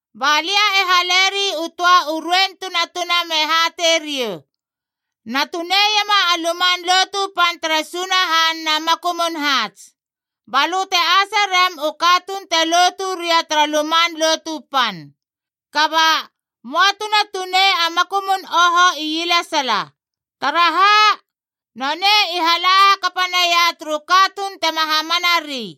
Ba lia e haleri u töa u ruein tunatuna me hatei riou, “Na tuneiema a Luman Lotu Pan tere Sunahan na makumun haats. Balö te ase rem u katuun te lotu ria tara Luman Lotu Pan. Kaba, möa tuna tunei a makumun oho ielesala. Taraha? Nonei i hala hakapa naia turu katuun tema hamanari.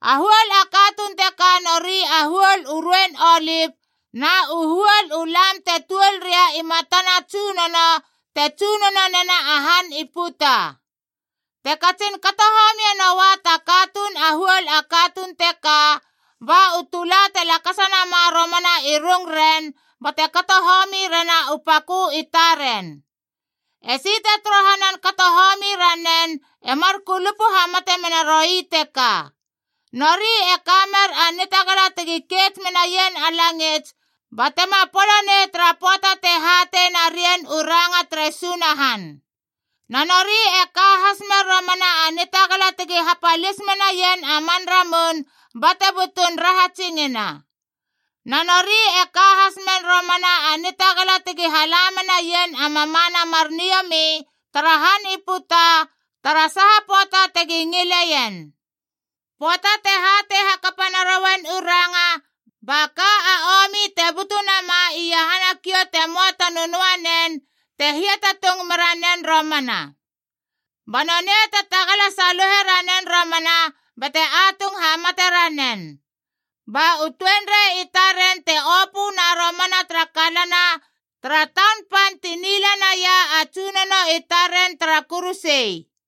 A huol a katuun teka nori u huol u ruein olipc na u huol u lam te tuol ria i matana Tsunono te tsunono nena a han i puta. Te katsin kato homie noua ta katuun a huol a katuun teka, ba u tula te lakasa nama romana i rungren bate kato homi rena u pakö i taren. Esi te torohanan kato homi ranen e mar kulupu hamate mena roi teka. Nori e ka mer a nitagala tegi keits menaien a langits ba tema polo nei tara pöata te hatei narien u ranga tere Sunahan. Na nori e ka has mer romana a nitagala tegi hapalis menaien a man ramun bate butun rahatsingina. Na nori e ka has mer romana a nitagala tegi hala menaien a mamana mar niomi tara han i puta tara saha pöata tegi ngileien. Pöata te hatei hakapa narouien u ranga, ba ka a omi te butu nama iahana kiou te möa ta nönöanen te hiatatung mera nen romana. Ba nonei te tagala saluhe ranen romana bate atung hamate ranen. Ba u tuenrei i taren te opöna romana tara kalana tara taun pan ti nila naia a Tsunono i taren tara kuruse.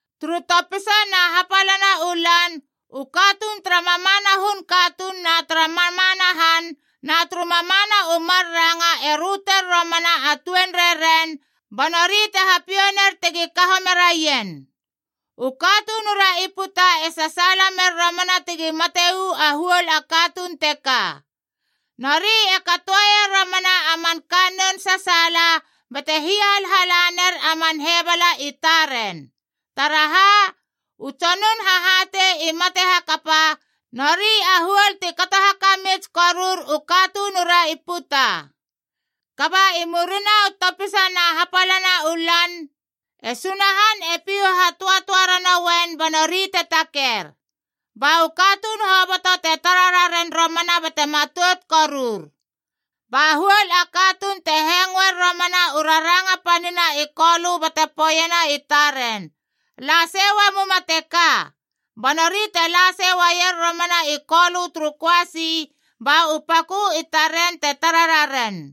Turu topisa na hapalana u lan, u katuun tara mamana hun katuun na tara mamana han na turu mamana u mar ranga e röter romana a tuenreiren, ba nori te hapiou ner tegi kaho meraien. U katunura i puta e sasaala mer romana tegi mate uu a huol a katuun teka. Nori e katoeier romana a man kannoun sasaala, bate hiahalhala ner a man hebala i taren. Taraha? U tsonun hahatei i mate hakapa, nori a huol ti kato hakamits korur u katunura i puta. Kaba i murina u topisa na hapala u lan, e Sunahan e pihu hatöatöa ranoen ba nori te taker. Ba u katuun hoboto te tara raren romana bate matout korur. Ba huol a katuun te hengoer romana u raranga panina i Kolö bate poeiena i taren, “La sei uamuma teka!” Ba nori te la sei uaier romana i Kolö turu köasi, ba u pakö i taren te tara raren.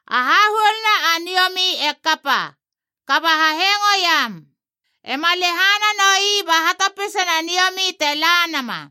A hahuoluna a niomi e kapa. Kaba hahengo iam! E ma lehana noi ba hatopisana niomi te la nama.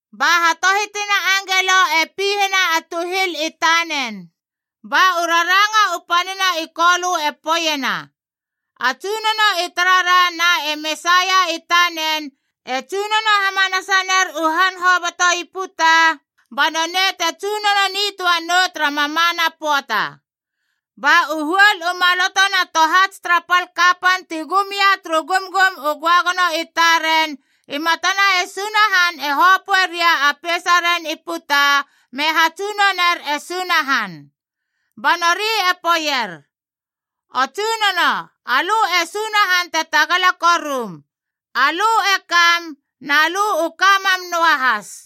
Ba hatohitina angelo e pihena a tuhil i tanen. Ba u raranga u panina i Kolö e poeiena: “A Tsunono i tarara na e Mesaia i tanen e tsunono hamanasa ner u han hoboto i puta, ba nonei te tsunono nitöa nou tara mamana pöata!” Ba u huol u maloto na tohats tara pal kapan ti gum ia turu gumgum u göagono i taren i matana e Sunahan e hopöe ria a peisaren i puta me hatsunoner e Sunahan. Ba nori e poeier: “O Tsunono, alö e Sunahan te Tagala Korum. Alö e kam, na lö u ka mam noahas.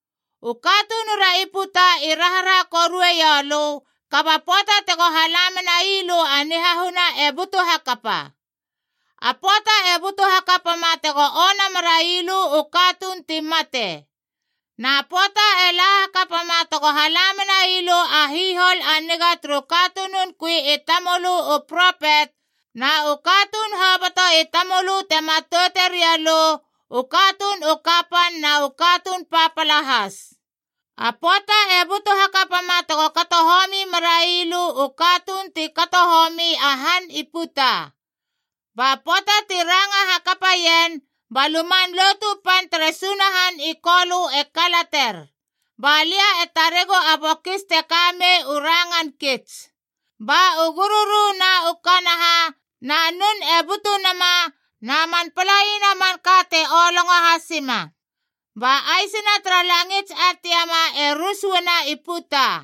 U katunura i putaf i raharaha korue ioulö, kaba pöata tego hala menai lö a nihahuna e butu hakapa.g A pöata e butu hakapama tego ona merai lö u katuun ti mate. Na pöata e la hakapama tego hala menai lö a hihol a niga turu katunun kui i tamölö u propet, na u katuun hoboto i tamölö te matoute riou lö, u katuun u kapan na u katuun papala has. A pöata e butu hakapama tego kato homi merai lö u katuun ti kato homi a han i puta!” Ba pöata ti ranga hakapa ien, ba Luman Lotu Pan tere Sunahan i Kolö e kalater, ba lia e taregu a bokis te ka mei u rangan kits. Ba u gururu na u kanaha na nun e butu nama na man palaina manka te olongo hasima, ba aisina tara langits a tiama e rus uana i puta.